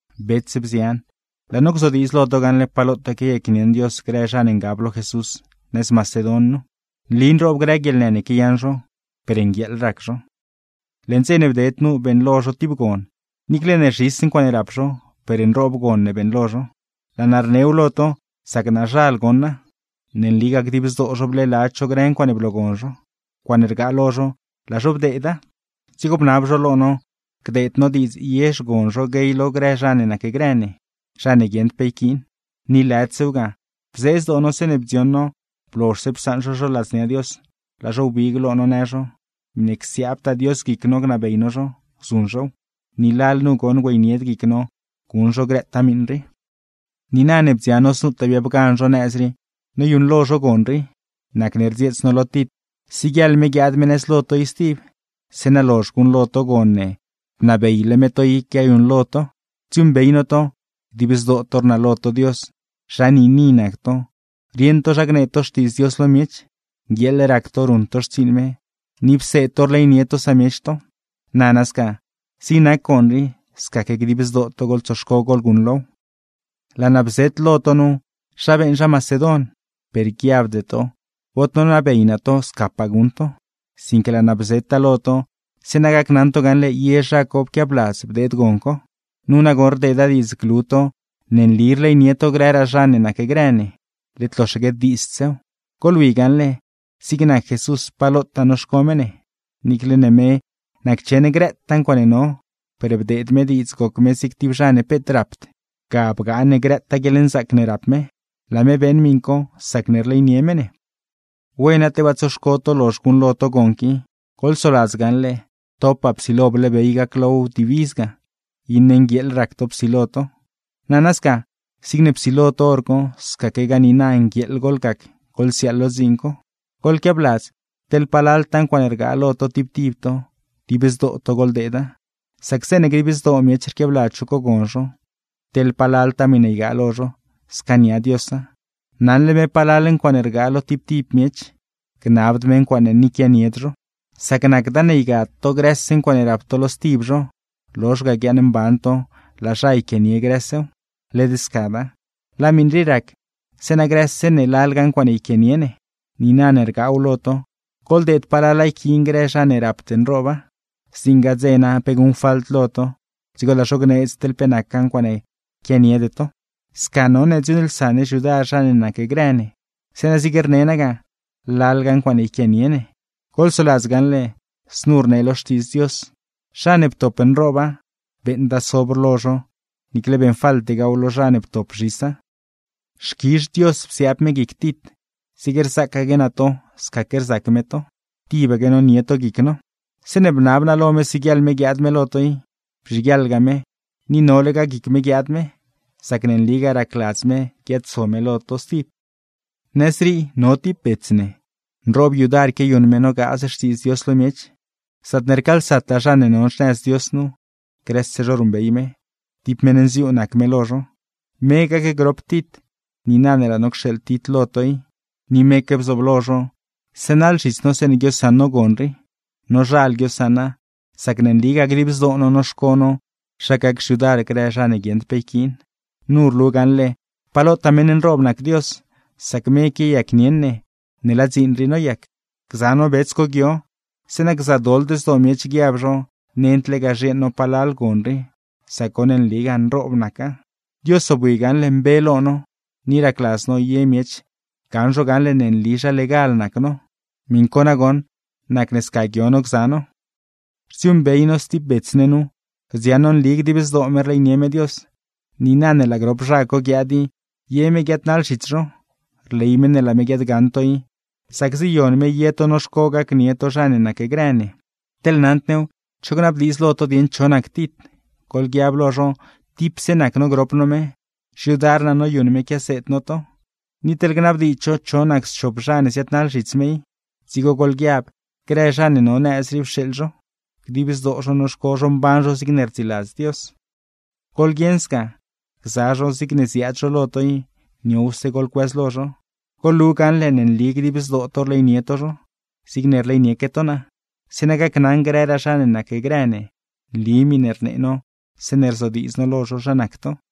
Bets, bzian, laa no gzodiidz lo to gaṉle pa lotaa quiayacnieṉ Dios grë zha ne ngab lo Jesús nëz Macedon nu. Nli nroob grë guieḻnë ne quiayaṉ zho, per nguieeḻ rac zho. Leṉ dze ne bded nu beeṉlo zho tib gon, niicle ne zhis ncuaaṉe rap zho, per nroob gon ne beeṉlo zho. Laa naa rnew lo to, sac naazhal goṉa. Ne nligaa, dib zdoo zho bleeladz zho grë ncuaaṉe bloogon zho; ncuaaṉe rgaataa lo zho laa zho bdeeda. Dzigo bnab zho lo no gdeed no diidz ye xgon zho guey lo grë zha ne nacgrë ne, zha ne guieṉd pe yquiin. Ni lëdsew ga, bzee zdoo no zeeṉe bdzioṉ no blozhse psaṉ zho zho ladznia Dios, laa zho wbig lo no në zho, miṉe csiaabtaa Dios guic no gnabey no zho, zuṉ zhow. Ni lalnu goṉ güeynied guic no guṉ zho grëtaa miṉ rii. Niina ne bdzioṉ no znutaa biabgan zho nëz rii noyuṉlo zho gon rii, nacne rdzieets no lo Tit siguieḻ me guiaad me nëz lo to i stib; zeeṉa lozh guṉlo to gon ne bnabeyle me to i quiayuṉlo to. Rdziuuṉbey no to: dib zdoo to rnalo to Dios, zha niini nac to, rieṉ to zha gnee to Xtiidz Dios lo miech, nguieeḻ rac to ruṉ to xtsiiṉ me, ni pseed to rleynie to samiech to. Nana sca, zig nac gon rii, scaque dib zdoo to goḻtsoxco goḻguṉlow. Laa naa bzet lo to nu zha beeṉ zha Macedon, per guiabde to bod nonabey naa to scapaa guṉ to. Sinque laa naa bzeta lo to, zeeṉa gacnaṉ to gaṉle ye zha co pquiabladz bdeed gon co. Nu nagoṉ rdeeda diidz glu to ne nli rleynie to grëraa zha ne nacgrë ne, led loxaque diidzdsew. Goḻwi gaṉle, zig nac Jesús pa lotaa noxco me ne. Niicle ne me naccheṉ grëtaa ncuaaṉe no, per bdeed me diidz goc me zig tib zha ne peet rapd; ga bgaa ne grëtaa guieḻnzaac ne rap me. Laa me beeṉ miṉ co sacne rleynie me ne. Wena, tebaa tsoxco to lozh guṉlo to gon qui. Goḻsoladz gaṉle, topaa psilo bleebey gaclow wdibiz ga, iṉe nguieeḻ rac to psilo to. Nana sca, zigne psilo to hor co, scaquegaa niina nguieeḻ goḻgac goḻsiaaḻ lo dziin co. Goḻquiabladz teḻ palaltaa ncuaaṉe rgaa lo to tib tib to, dib zdoo to goḻdeeda; sac zeeṉe dib zdoo miech rquiabladz zho cogon zho, teḻ palaltaa miṉe ygaa lo zho, scaania Diosa. Naṉle me palal ncuaaṉe rgaa lo tib tib miech, gnabd me ncuaaṉe ni quianied zho. Sac nacda ne ygad to grëse ncuaaṉe rap to lo stib zho, lozh ga guiaaṉmban to; laa zha yquianie grësew. Led scada. Laa miṉ rii rac, zeeṉa grëse ne lalga ncuaaṉe yquianie ne. Niina ne rgaaw lo to, goḻdeed palala yquiin grë zha ne rapd nrooba; zdziṉgaa dze na pe guṉfalt lo to, dzigo laa zho gneedz teḻ pe nacgaa ncuaaṉe quianiede to. Sca none dziuuṉlsa ne xyudar zha ne nacgrë ne, zeeṉa zig rne naa ga: lalga ncuaaṉe yquianie ne. Goḻsoladz gaṉle, znu rnee lo Xtiidz Dios: “Zha ne ptop nrooba, beeṉda sobr lo zho; niicle beeṉfaltegaaw lo zha ne ptop zhisa.” Xquizh Dios psiaab me guic Tit, zigne rzacaque naa to scaque rzac me to; tibaque nonie to guic no. Zeeṉe bnab naa lo me siguieḻ me guiaad me lo to i, bzhiguieḻga me; ni nolegaa guic me guiaad me, sac ne nligaa racladz me guiaadso me lo to stib. Nëz rii, no tib bets ne, nroob yudar quiayuṉ me nogaaz Xtiidz Dios lo miech; zaatne rcaalsataa zha ne no xnëz Dios nu, grëse zho ruṉbey me, tib meṉ nziuu nac me lo zho. Me gacgrop Tit, niina ne laa no cxeeḻ Tit lo to i; ni meque bzooblo zho, sënaḻ zhits no zeeṉe guiosaṉ no gon rii. Nozhal guiosaṉa, sac ne nligaa dib zdoo no noxco no zha gac xyudar grë zha ne guieṉd pe yquiin. Nu rlu gaṉle pa lotaa meṉ nroob nac Dios, sac me quiayacnieṉ ne ne laa dziin rii noyac. Gza no bets co guio, zeeṉa gzadoḻd zdoo miech guiab zho nend zha lega zhieeṉ no palal gon rii, sac goṉ nligaa nroob naca. Dios zobwi gaṉle mbe lo no, ni racladz no ye miech gaṉ zho gaṉle ne nli zha legal nac no. Miṉ co nagoṉ, nacne sca guio no gza no. Rdziuuṉbey no stib bets ne nu, rdziaṉ no nli dib zdoo me rleynie me Dios. Niina ne laa grop zha co guiaad i, ye me guiaadnaḻ zhits zho. Rley me ne laa me guiaadgaṉ to i, sac ziyon me ye to noxco gacnie to zha ne nacgrë ne. Teḻ naṉd new cho gnabdiidz lo to dieṉ cho nac Tit, goḻguiab lo zho tipse nac no grop no me, xyudar naa noyuṉ me quiaseed no to. Ni teḻ gnabdiidz zho cho nac schop zha ne ziaadnaḻ zhits me i, dzigo goḻguiab grë zha ne ne no nëz rii pxeeḻ zho, dib zdoo zho noxco zho mban zho zigne rdziladz Dios. Goḻguieṉ sca, gza zho zigne ziaad zho lo to i, niowse goḻcuëzlo zho. Goḻlu gaṉle ne nli dib zdoo to rleynie to zho, zigne rleynieque to naa; zeeṉa gacnaṉ grëraa zha ne nacgrë ne nli miṉe rnee no zeeṉe rzodiidz no lo zho zha nac to.